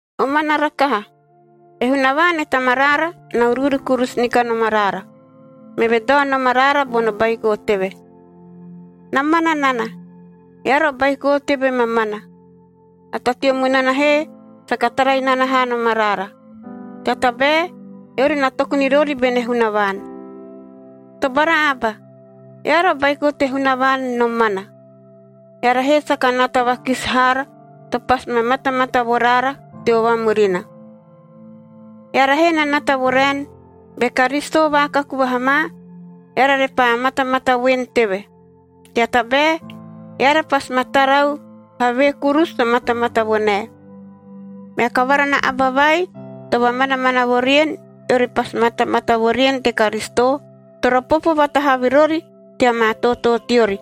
Omana rakaha! E Hunavaan e Tamaraara na uruuru kurusu ni kanom araara, meve dao nom araara bono baiko teve. Na mana nana – eara o baiko teve mamana! A ta teo munana he saka tara inana haa nom araara, tea tabae eori na toku ni rori bene Hunavaan. Tobara aba! Eara o baiko te Hunavaan nomana, eara he saka nata vakisi haara to pasi ma matamata vo raara teo vamurina. Eara he na nata vo raen, be Karisito vaakaku vaha ma, eara repaa matamata voen teve, tea tabae eara pasi ma tarau havee kurusu to matamata vo nae. Mea kavara na aba vai to vamanamana vo rien, eori pasi matamata vo rien te Karisito, toro popo vatahavi rori tea maa tootoo teori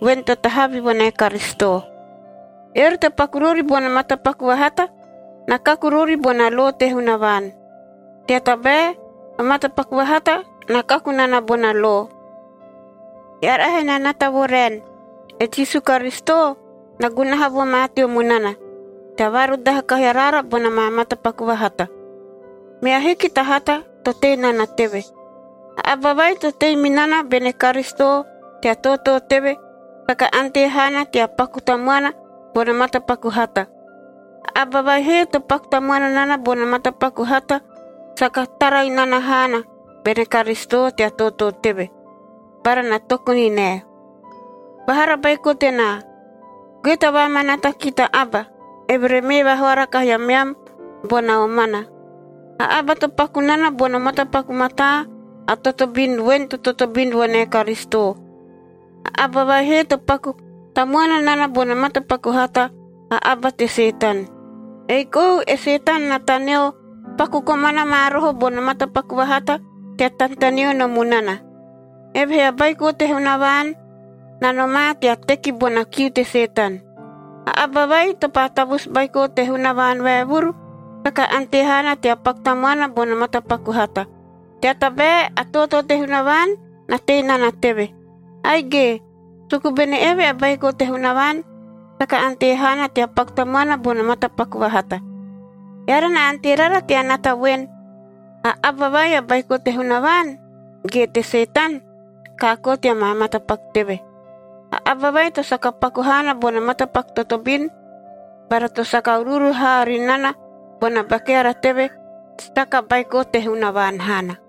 voen to tahavi vo nae Karisito. Eori to paku rori bono matapaku vahata, na kaku rori bona lo te Hunavaan. Tea tabae o matapaku vahata na kaku nana bona lo. Eara he na nata vo raen, e Jisu Karisito na gunaha vo ma teo munana, tea vaarudaha kahi araara bona maa matapaku vahata. Mea ahiki ta hata to tei nana teve. A aba vai to tei mi nana bene Karisito tea tootoo teve saka ante haana tea paku tamuana bono matapaku hata. A aba vai he to paku tamuana nana bono matapaku hata, saka tara inana haana bene Karisito tea tootoo teve, bara na toku ni nae. Vahara baiko tenaa, goe tea vaamanaata ki ta aba, eve re mee vahoara kahi ameam bona omana. A aba to paku nana bono matapaku mataa, a totobin voen to totobin vo nae Karisito. A aba vai he to paku tamuana nana bono matapaku hata, a aba te Setan. Ei kou e Setan na taneo paku komana ma roho bono matapaku vahata tea tanetaneo no munana. Evehee a Baiko te Hunavaan na nomaa tea teki bona kiu te Setan. A aba vai to paa tavusu baiko te Hunavaan vaevuru, saka ante haana tea paku tamuana bono matapaku hata, tea tabae a tootoo te Hunavaan na tei nana teve. Aige, suku bene eve a baiko te Hunavaan, saka ante haana tea paku tamuana bono matapaku vahata. Eara na ante rara tea nata voen, a aba vai a baiko te Hunavaan ge te Setan, kaakoo tea maa matapaku teve. A aba vai to saka paku haana bono matapaku totobin bara to saka uruuru haa ri nana bona ba keara teve, saka baiko te Hunavaan haana.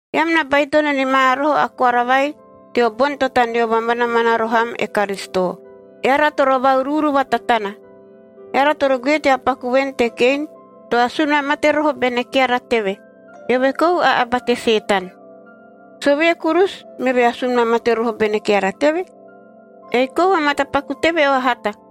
Eam na baitono ni ma roho a koara vai teo boni to taneo vamanamana roho am e Karisito: Eara toro va-uruuru vatatana. Eara toro goe tea paku voen te Kein to asun vamate roho bene keara teve. Eove kou a aba te Setan. Sovee kurusu meve asun vamate roho bene keara teve? Ei kou o matapaku teve o hata,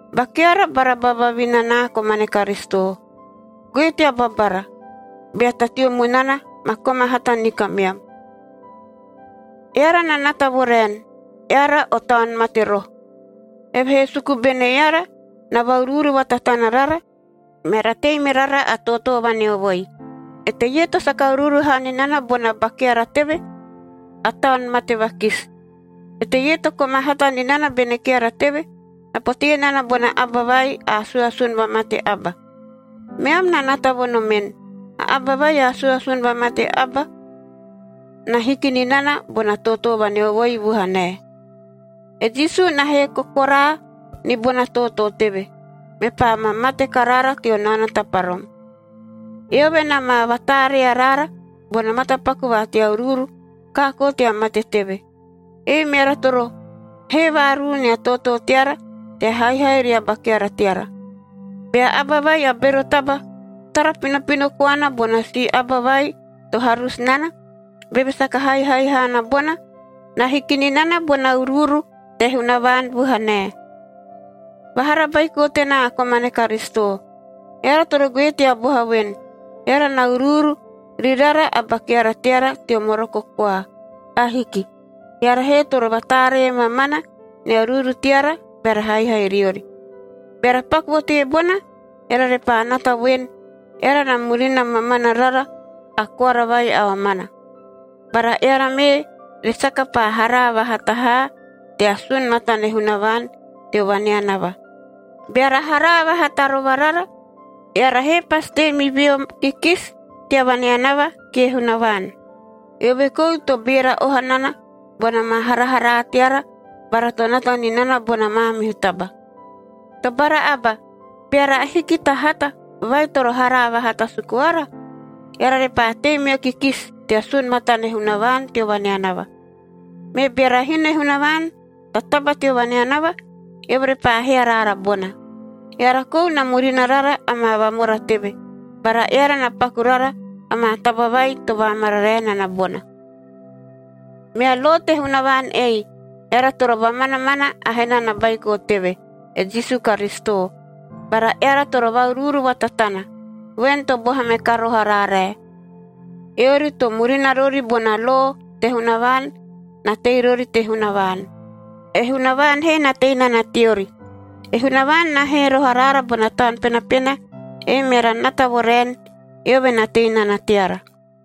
Ba keara bara ba vavinanaa komane Karisito! Goe tea babara, bea ta teo munana ma koma hata ni kameam. Eara na nata vo raen, eara o taun mate roho, evehee suku bene eara na va-uruuru vatatana rara, meara tei me rara a tootoo vaneovoi. Eteie to saka uruuru haa ni nana bona ba keara teve, a taun mate vakisi. Eteie to koma hata ni nana bene keara teve, na potee nana bona aba vai a asuasun vamate aba. Meam na nata vo nomen, a aba vai a asuasun vamate aba, na hiki ni nana bona tootoo vaneovoi vuhanae. E Jisu na hee kokoraa ni bona tootoo teve, mepaa ma mate karaara teo naono taparom. Eove na ma vataaree araara bono matapaku va tea uruuru kaakoo tea mate teve. Ei meara toro hee vaaruu nia tootoo teara tea haihai ria ba keara teara. Bea aba vai a bero taba tara pinopino koana bona si aba vai to harusu nana, beve saka haihai haana bona, na hiki ni nana bona uruuru te Hunavaan vuhanae. Vahara baiko tenaa komane Karisito! Eara toro goe tea boha voen, eara na uruuru ri rara a ba keara teara teo moroko koa. Ahiki. Eara he toro vataaree mamana nia uruuru teara beara haihai riori. Beara paku vo teebona, eara repaa nata voen, eara na murina mamana rara a koara vai a omana. Bara eara mee re saka paa haraa vahata haa tea sun matane Hunavaan teo vaneanava. Beara haraa vahata rova rara, eara he pasi tei mi veo kikisi tea vaneanava kie Hunavaan. Eove kou to beera oha nana bona maa haraharaa teara bara to nata ni nana bona maamihu taba. Tobara aba! Beara ahiki ta hata vai toro haraa vahata suku ara, eara repaa tei meo kikisi tea sun matane Hunavaan teo vaneanava. Me beara hino e Hunavaan ta taba teo vaneanava, eove repaa hee araara bona. Eara kou na murina rara amaa vamora teve, bara eara na paku rara amaa taba vai to vaamararae nana bona. Mea lo te Hunavaan ei: Eara toro vamanamana a hena na Baiko teve, e Jisu Karisito. Bara eara toro va-uruuru vatatana, voen to boha me ka roho araarae. Eori to murina rori bona lo te Hunavaan na tei rori te Hunavaan, e Hunavaan he na tei nana teori. E Hunavaan na hee roho araara bona Taun Penapena, ei meara nata vo raen, eove na tei nana teara.